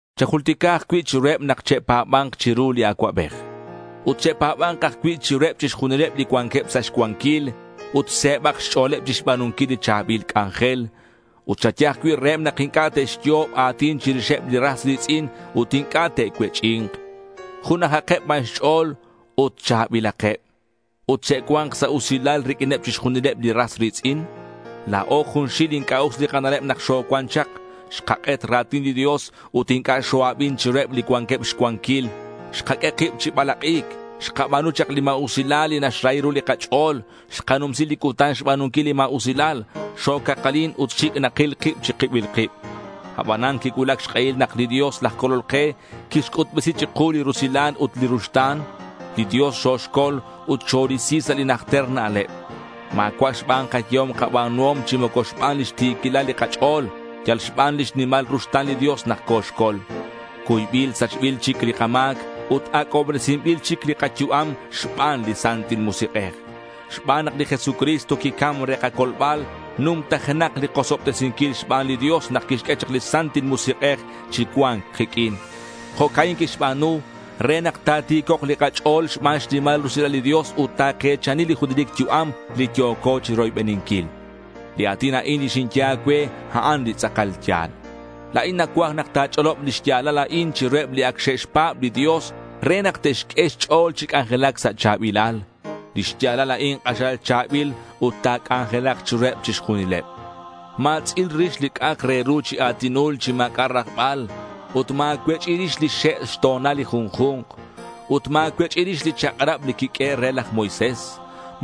Chajultica ajcui' chiruheb nak che'pa̱ba̱nk chiru li acuabej. Ut che'pa̱ba̱nk ajcui' chiruheb chixjunileb li cuanqueb sa' xcuanquil. Ut se̱bak xch'o̱leb chixba̱nunquil li cha̱bil c'anjel. Ut chaye ajcui' reheb nak inc'a' te'xyo'ob a̱tin chirixeb li ras ri̱tz'in ut inc'a' te'cuech'i̱nk. K'unakeb ban xch'o̱l ut cha̱bilakeb. Ut che'cua̱nk sa' usilal riq'uineb chixjunileb li ras ri̱tz'in. La̱o junxil inc'a' us li kana'leb nak xocuan chak. Xkak'et ra̱tin li Dios ut inc'a' xo-abin chiruheb li cuanqueb xcuanquil. Xkaq'ue kib chi balak'i̱c. Xkaba̱nu chak li ma̱usilal li naxrahi ru li kach'o̱l. Xkanumsi li cutan xba̱nunquil li ma̱usilal. Xocakalin ut xic' nakil kib chi kibil kib. Abanan quicuulac xk'ehil nak li Dios laj Colol ke quixc'utbesi chiku li rusilal ut li ruxta̱n. Li Dios xoxcol ut xorisi sa' li kanajter na'leb. Ma̱cua' xban kayehom kaba̱nuhom chi moco xban lix ti̱quilal li kach'o̱l. Yal xban lix nimal ruxta̱n li Dios nak coxcol. Cuybil sachbil chic li kama̱c ut ac'obresinbil chic li kayu'am xban li Santil Musik'ej. Xban nak li Jesucristo quicam re kacolbal, numtajenak li kosobtesinquil xban li Dios nak quixq'ue chak li Santil Musik'ej chi cua̱nc kiq'uin. Jo'ca'in quixba̱nu re nak ta̱ti̱cok' li kach'o̱l xban xnimal rusilal li Dios ut take̱chani li junelic yu'am li yo̱co chiroybeninquil. Li a̱tin a'in li xinye a̱cue, a'an li tz'akal ya̱l. La̱in nacuaj nak ta̱ch'olob li xya̱lal a'in chiruheb li ac xe'xpa̱b li Dios re nak te'xq'ue xch'o̱l chi c'anjelac sa' cha̱bilal. Li xya̱lal a'in k'axal cha̱bil ut ta̱c'anjelak chiruheb chixjunileb. Ma̱tz'il rix li c'a'ak re ru chi a̱tinul li ma̱c'a' rajbal ut ma̱cuech'i rix lix xe' xto̱nal li junju̱nk. Ut ma̱cuech'i rix li chak'rab li quiq'uehe' re laj Moisés.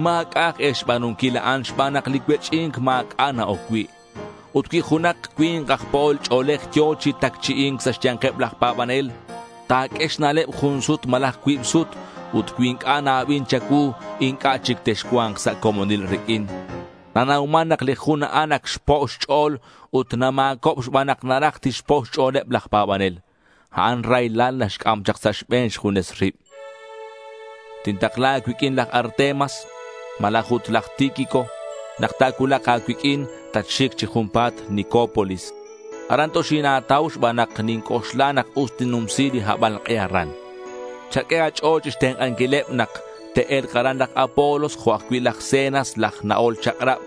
Ma̱c'a' aj e xba̱nunquil a'an xban nak li cuech'i̱nc ma̱c'a' na-oc cui'. Ut cui junak cui̱nk aj po'ol ch'o̱lej yo̱ chi tacchi'i̱nc sa' xya̱nkeb laj pa̱banel, ta̱q'ue xna'leb jun sut malaj cuib sut ut cui inc'a' na-abin cha̱cuu, inc'a' chic texcua̱nk sa' comonil riq'uin. Nanauman nak li jun a'an ac xpo' xch'o̱l ut nama̱cob xban nak naraj tixpo' xch'o̱leb laj pa̱banel. A'an raylal naxc'am chak sa' xbe̱n xjunes rib. Tintakla a̱cuiq'uin laj Artemas malaj ut laj Tíquico. Nak ta̱cuulak a̱cuiq'uin, tatxic chi junpa̱t Nicópolis. Aran toxina̱tau xban nak ninc'oxla nak us tinnumsi li habalk'e aran. Chaq'ue a̱ch'o̱l chixtenk'anquileb nak te'e̱lk aran laj Apolos jo' ajcui' laj Zenas laj na'ol chak'rab.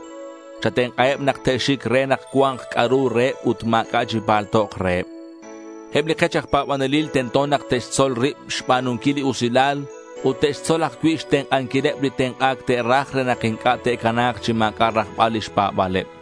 Chatenk'aheb nak te'xic re nak cua̱nk c'a'ru reheb ut ma̱c'a' chipaltok reheb. Eb li kech aj pa̱banelil tento nak te'xtzol rib xba̱nunquil li usilal ut te'xtzol ajcui' xtenk'anquileb li tenk'a̱c te'raj re nak inc'a' ta̱cana̱k chi ma̱c'a' rajbal lix pa̱ba̱leb.